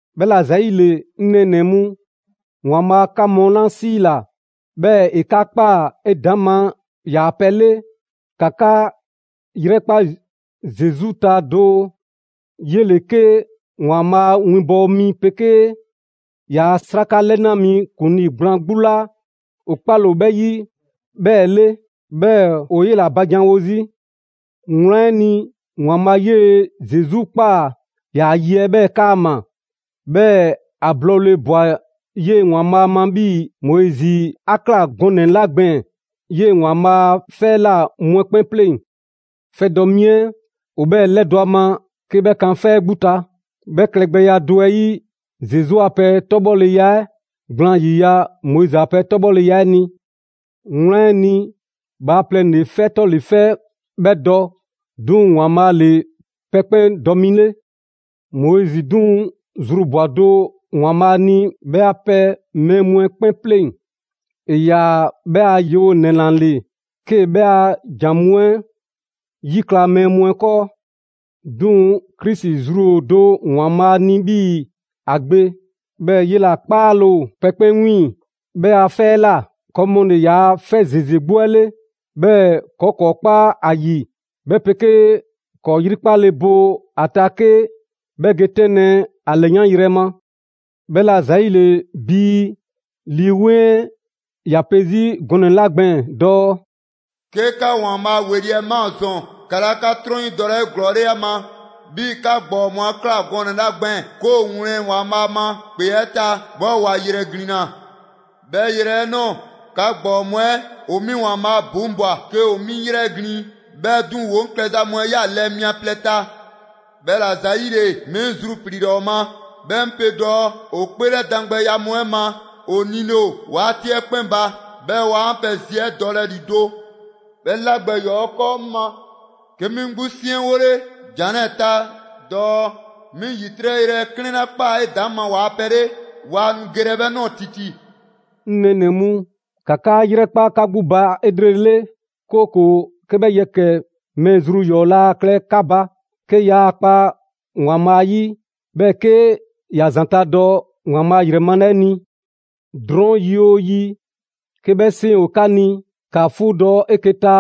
'Bhɛla‑ ‑zayile, 'ŋ nɛɛnɛ‑ mu, ‑Waanbhaa' 'ka mu 'la 'siila‑, 'bhɛɛ‑ ‑e 'ka ꞊kpaa 'edaŋma ‑yaa' pɛ 'le, ‑ka 'ka 'yrɛkpa Zesu ta doo; 'yele‑ 'ke ‑Waanbhaa' a winbɔwo mi 'pegee ‑yaa' 'sraka 'lɛna mi ‑kuŋlii gblaan 'gbu 'la 'o 'kpale‑ ‑o 'bhɛ 'yi 'bhɛɛ‑ 'le; 'bhɛɛ‑ 'o 'yela ba janwo 'zi. Wlan 'ɛ ni, ‑Waanbhaa' 'yee‑ Zesu ꞊kpaa ‑yaa' ye 'ɛ 'bhɛɛ‑ 'kaama‑; 'bhɛɛ‑ ‑a blɔɔle ꞊bwa 'yee‑ ‑Waanbhaa' ma 'bhii‑ Moizi 'a ꞊kla gɔnɛ‑ 'la gbɛɛn‑ 'yee‑ ‑Waanbhaa' a 'fɛ 'ɛ ꞊la mu 'ɛ 'kpɛn 'pleŋ‑. 'Fɛdɔ‑ 'mi 'ɛ, ‑o 'bhɛɛ‑ ‑lɛdɔ' ‑a ma 'ke 'bhɛ kan 'fɛ 'ɛ 'gbu ta. 'Bhɛ klɛgbɛya do 'ɛ 'yi, Zesu a pɛ 'tɔbhɔleya 'ɛ gblaan ‑yiya' Moizi a pɛ 'tɔbhɔleya 'ɛ ni. Wlan 'ɛ ni, bhaaplɛŋ ‑le 'fɛ 'tɔle‑ 'fɛ 'bhɛ dɔ, 'duŋ‑ ‑Waanbhaa' ‑le pɛ 'kpɛn dɔ mi 'le. Moizi 'duŋ‑ zru ꞊bwa do ‑Waanbhaa' ni 'bhɛ a pɛ mɛɛ mu 'ɛ 'kpɛn 'pleŋ‑. ‑E ‑yaa' 'bhɛ a yewonɛ ‑la ‑le, 'kee‑ 'bhɛ a ‑jan mu 'ɛ 'yikla‑ mɛɛ mu 'ɛ 'kɔɔ. 'Duŋ‑, Krisi zru ‑o do ‑Waanbhaa' ni 'bhii‑ ‑a Gbe, 'bhɛɛ‑ 'yela‑ 'kpaale‑ ‑o pɛ 'kpɛn 'wiiŋ‑ 'bhɛ a 'fɛ 'ɛ ꞊la. ‑Kɔɔ' mu ‑le ‑yaa' 'fɛ ‑zeze 'gbu 'ɛ 'le, 'bhɛɛ‑ ‑kɔɔ' ‑kɔɔ' kpa ‑a ‑yi, 'bhɛ pegee ‑kɔɔ' 'yrikpale bo a ta 'ke 'bhɛ ge 'tɛnlɛ‑ ‑a ‑lɛyanyrɛ ma. 'Bhɛla‑ ‑zayile, 'bhii‑ Lii 'Weŋ 'ɛ ‑ya pe 'zi gɔnɛ‑ 'la gbɛɛn‑ dɔɔ: «'Ke 'ka ‑Waanbhaa' ‑weli' 'ɛ ꞊maa ‑zɔn, 'ka 'laa 'ka 'trɔn 'yi dɔlɛ 'eglɔɔle ‑a ma, 'bhii‑ 'ka ‑gbɔɔ mu 'a ꞊kla gɔnɛ‑ 'la gbɛɛn‑ 'ke ‑o ‑wlɛn ‑Waanbhaa' ma ‑kpe 'ɛ ta, 'bhɛɛ‑ ‑wa ‑yrɛ ‑glinna. 'Bhɛ yrɛ 'ɛ ꞊nɔɔ, 'ka ‑gbɔɔ mu 'ɛ ‑o 'mi ‑Waanbhaa' ‑buŋbwa 'ke ‑o 'mi ‑yrɛglin'. 'Bhɛɛ‑ 'duŋ‑, ‑woo 'ŋ klɛza mu 'ɛ ꞊ya lɛɛ mia plɛ ta. 'Bhɛla‑ ‑zayile, 'mi 'ŋ zrupliila ‑o ma, 'bhɛɛ‑ 'ŋ pe dɔɔ: ‹‑O 'kpeelɛdan gbɛya mu 'ɛ ma, ‑o nile ‑o 'waati 'ɛ 'kpɛn ba; 'bhɛɛ‑ waa 'an pɛ zi 'ɛ dɔlɛ ‑lido'.› 'Bhɛ 'la gbɛ ‑yɔɔ' 'ɛ 'kɔɔ 'ŋ ma, 'ke 'mi 'gbu 'ŋ 'siɛnwole ‑jan 'lɛɛ‑ ta dɔɔ: 'Mi ‑yitrɛ' yrɛ 'klɛɛn 'la ꞊kpaa 'edaŋma ‑waa' pɛ 'le, waa nu gelɛ 'bhɛ ꞊nɔɔ ‑titi!» 'Ŋ nɛɛnɛ‑ mu, ‑ka 'ka 'yrɛkpa 'ka 'gbu ba 'elrele, 'kooko‑ 'ke 'bhɛ yɛkɛ‑ mɛɛ zru ‑yɔɔ 'laa klɛ 'ka ba, 'ke yaa kpa ‑Waanbhaa' 'yi, 'bhɛɛ‑ 'ke ‑ya ‑zanta' dɔ ‑Waanbhaa' ‑yrɛ male 'ɛ ni. Drɔɔn' yi 'oo yi, 'ke 'bhɛ 'seŋ ‑o 'ka ni, ‑ka 'fuudɔ‑ 'eke‑ ta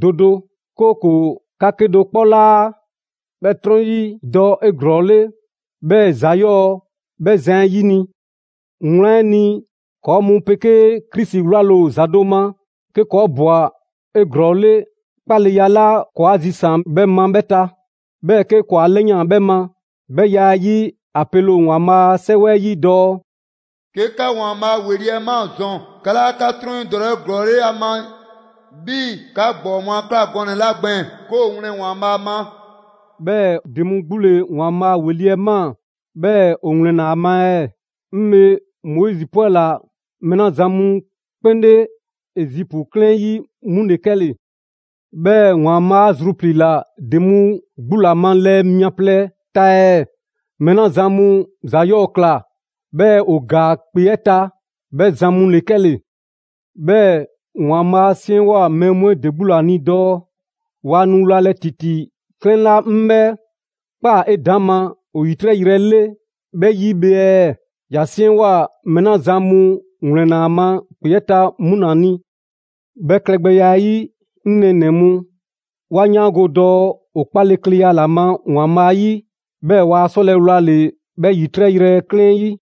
do do, 'kooko‑ 'ka 'kedo‑ 'kpɔ 'laa 'bhɛ 'trɔn 'yi dɔ 'eglɔɔle, 'bhɛɛ‑ ‑za 'yɔɔ‑ 'bhɛ zan 'ɛ 'yini‑. Wlan 'ɛ ni, ‑kɔɔ' mu 'pegee Krisi 'wlale‑ ‑o ‑za do ma, 'ke ‑kɔɔ' ꞊bwa 'eglɔɔle 'kpaleya 'la ‑kɔɔ' 'a zisaan‑ 'bhɛ ma 'bhɛ ta, 'bhɛɛ‑ 'ke ‑kɔɔ' 'a 'lɛyan‑ 'bhɛ ma. 'Bhɛ ya 'ɛ 'yi, ‑a pele ‑o ‑Waanbhaa' a 'Sɛwɛ 'ɛ 'yi dɔɔ: «'Ke 'ka ‑Waanbhaa' ‑weli' 'ɛ ꞊maa ‑zɔn, 'ka 'laa 'ka 'trɔn 'yi dɔlɛ 'eglɔɔle ‑a ma, 'bhii‑ 'ka ‑gbɔɔ mu a ꞊kla gɔnɛ‑ 'la gbɛɛn‑ 'ke ‑o wlɛn ‑Waanbhaa' ma.» 'Bhɛɛ‑ ‑de mu 'gbu ‑le ‑Waanbhaa' ‑weli' 'ɛ ꞊maa, 'bhɛɛ‑ ‑o ‑wlɛnna ‑a ma ɛɛ? 'Ŋ bhe, Moizi 'pwɛla‑ mɛɛ 'la zan mu 'kpɛn 'le Ezipu 'klɛɛn 'ɛ 'yi, 'mu ‑le 'kɛle‑. 'Bhɛɛ‑ ‑Waanbhaa' 'a zrupliila ‑de mu 'gbu ‑la ma lɛɛ mia plɛ ta ɛɛ? Mɛɛ 'la zan mu ‑za 'yɔɔ‑ ‑kla, 'bhɛɛ‑ ‑o ‑gaa ‑kpe 'ɛ ta, 'bhɛ zan mu ‑le 'kɛle‑. 'Bhɛɛ‑ ‑Waanbhaa' 'a 'siɛnwoa‑ mɛɛ mu 'ɛ ‑de 'gbu ‑la ni dɔɔ: «Waa nu wlalɛ ‑titi 'klɛɛn 'la 'ŋ 'bhɛ ꞊kpaa 'edaŋma ‑o ‑yitrɛ' yrɛ 'le 'bhɛ 'yi bhe ɛɛ?» ‑Ya 'siɛnwoa‑ mɛɛ 'la zan mu ‑wlɛnna ‑a ma ‑kpe 'ɛ ta 'mu ‑la ni. 'Bhɛ klɛgbɛya 'ɛ 'yi, 'ŋ nɛɛnɛ‑ mu, 'wa 'yaango‑ dɔɔ ‑o 'kpalekleya ‑la ma ‑Waanbhaa' 'yi, 'bhɛɛ‑ waa 'sɔlɛ‑ wlale‑ 'bhɛ ‑yitrɛ' yrɛ 'klɛɛn 'ɛ 'yi.